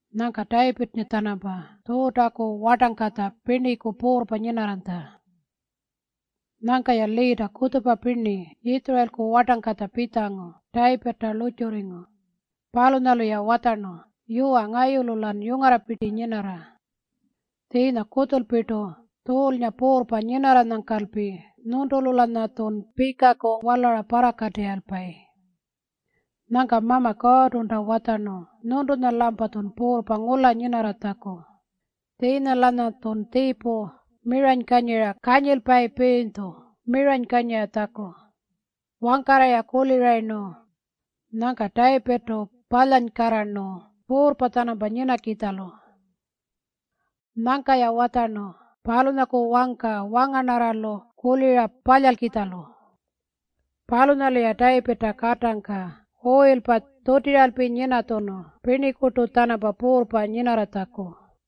Nyangka Tayipirrnga-tjanampa Tjuutaku wartangkatja pirniku puurrpa nyinarranytja. Nyangka-ya liita kutjupa pirni Yitjurayilku wartangkatja pitjangu Tayipirrta lurrtjurringu. Palunyalu-ya watjarnu, “Yuwa, ngayulu-lan yungarrapirti nyinarra. Tjiinya kutjulpirtu Tjuulnga puurrpa nyinarranyangkalpi nyuntulu-lanyatjun pikaku walara parrakatirrayilpayi. Nyangka Mama Kuurrtunta watjarnu nyuntunya-lampatjun puurrpa ngula nyinarratjaku, tjiinya-lanyatjun tjiipu miranykanyira kanyilpayipirinytju miranykanyiratjaku.” Wangkarra-ya kulirayirnu, nyangka Tayipirrtu palyarnkarrarnu puurrpa-tjanampa nyinakitjalu. Nyangka-ya watjarnu palunyaku wangka wangarnarralu kulira palyalkitjalu. Palunyalu-ya Tayipirrta katangka uyilpa tjutiralpi nyinatjunu pirnikurtu-tjanampa puurrpa nyinarratjaku.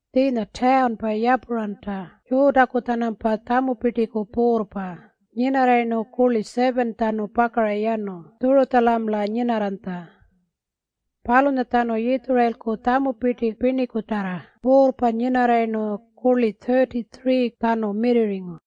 Tjiinya tawunpa Yapuranta Tjuutaku-tjanampa tjamupirtiku puurrpa nyinarrayirnu kurli 7-tjanu pakara yanu Tjurutjamala nyinarranytja. Palunyatjanu Yitjurayilku tjamupirti pirnikutarra puurrpa nyinarrayirnu kurli 33-tjanu mirrirringu.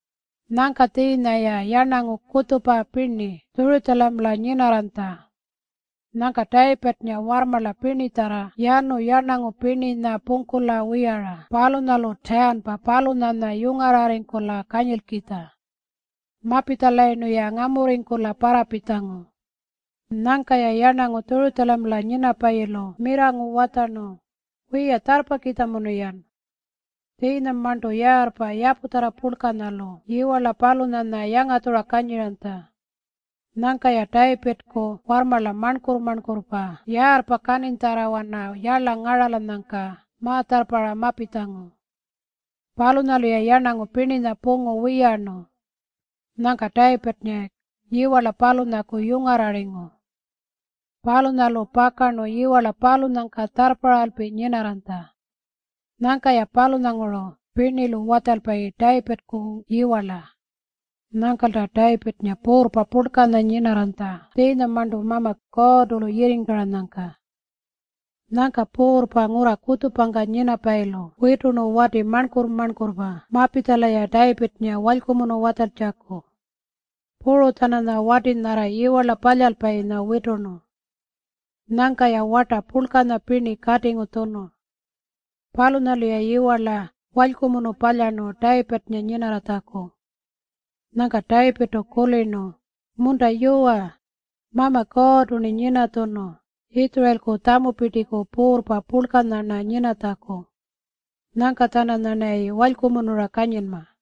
Nyangka tjiinya-ya yarnangu kutjupa pirni Tjurutjamala nyinarranytja. Nyangka Tayipirrnga warrmarla pirnitjarra yanu yarnangu pirninya pungkula wiyara palunyalu tawunpa palunyanya yungarrarringkula kanyilkitja. Mapitjalayirnu-ya ngamurringkula parrapitjangu. Nyangka-ya yarnangu Tjurutjamala nyinapayilu mirrangu watjarnu, “Wiya, tjarrpakitjamunu-yan.” Tjiinyamarntu yaarrpa yaputjarra purlkanyalu yiwarla palunyanya yangatjura kanyiranytja. Nyangka-ya Tayipirrku warrmarla marnkurr-marnkurrpa yaarrpa kaninytjarrawana yarla ngaralanyangka ma-tjarrparra mapitjangu. Palunyalu-ya yarnangu pirninya pungu wiyarnu. Nyangka Tayipirrnga yiwarla palunyaku yungarrarringu. Palunyalu pakarnu yiwarla palunyangka tjarrparralpi nyinarranytja. Nyangka-ya palunyanguru pirnilu watjalpayi Tayipirrku yiwarla. Nyangkalta Tayipirrnga puurrpa purlkanya nyinarranytja tjiinyamarntu Mama Kuurrtu-lu yirringkaranyangka. Nyangka puurrpa ngurra kutjupangka nyinapayilu witurnu wati marnkurr-marnkurrpa mapitjala-ya Tayipirrnga walykumunu watjaltjaku. Puru-tjananya wati nyarra yiwarla palyalpayinya witurnu. Nyangka-ya warta purlkanya pirni katingu tjunu. Palunyalu-ya yiwarla walykumunu palyarnu Tayipirrnga nyinarratjaku. Nyangka Tayipirrtu kulirnu, “Munta yuwa, Mama Kuurrtu-rni nyinatjunu Yitjurayilku tjamupirtiku puurrpa purlkanya-rna nyinatjaku. Nyangka-tjananyarnayi walykumunura kanyinma.”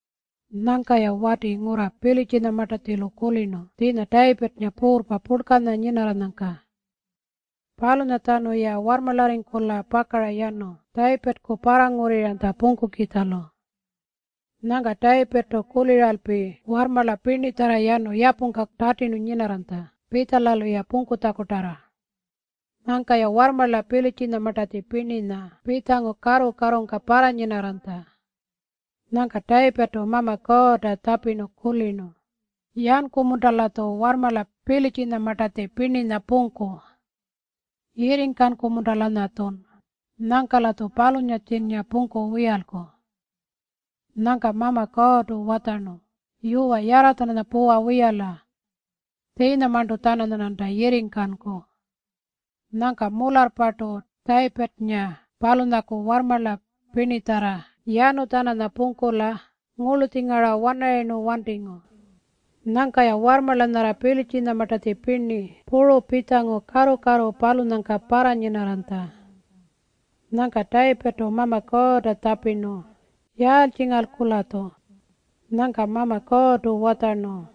Nyangka-ya wati ngurra Pilitjinyamartatjilu kulirnu tjiinya Tayipirrnga puurrpa purlkanya nyinarranyangka. Palunyatjanu-ya warrmarlarringkula pakara yanu Tayipirrku parrangurriranytja pungkukitjalu. Nyangka Tayipirrtu kuliralpi warrmarla pirnitjarra yanu yapungka tatirnu nyinarranytja pitjala-luya pungkutjakutarra. Nyangka-ya warrmarla Pilitjinyamartatji pirninya pitjangu karru-karrungka parranyinarranytja. Nyangka Tayipirrtu Mama Kuurrnga tjapirnu, “Yanku-munta-latju warrmarla Pilitjinyamartatji pirninya pungku? Yirringkanku-munta-lanyatjun nyangka-latju palunyatjinnga pungku wiyalku?” Nyangka Mama Kuurrtu watjarnu, “Yuwa, yarra-tjananya puwa wiyala. Tjiinyamarntu-tjananyarnanta yirringkanku.” Nyangka mularrpartu Tayipirrnga palunyaku warrmarla pirnitjarra yanu-tjananya pungkula ngurlutjingara wanarayirnu wantingu. Nyangka-ya warrmarla nyarra Pilitjinyamartatji pirni puru pitjangu karru-karru palunyangka parranyinarranytja. Nyangka Tayipirrtu Mama Kuurrta tjapirnu, “Yaaltjingalku-latju?” Nyangka Mama Kuurrtu watjarnu,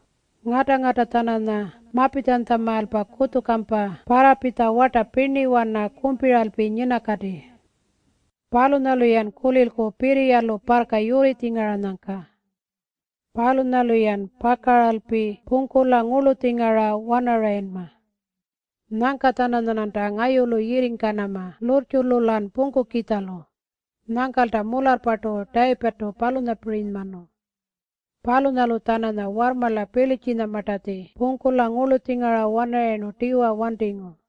“Ngata-ngata-tjananya mapitjanytjamaalpa kutjupakampa parrapitja warta pirniwana kumpiralpi nyinakati. Palunyalu-yan kulilku pirriyalu parrka yurritjingaranyangka. Palunyalu-yan pakaralpi pungkula ngurlutjingara wanarayinma. Nyangka-tjananyarnanta ngayulu yirringkanama lurrtjulu-lan pungkukitjalu.” Nyangkalta mularrpartu Tayipirrtu palunyapirinymanu. Palunyalu-tjananya warrmarla Pilitjinyamartatji pungkula ngurlutjingara wanarayirnu tiwa wantingu.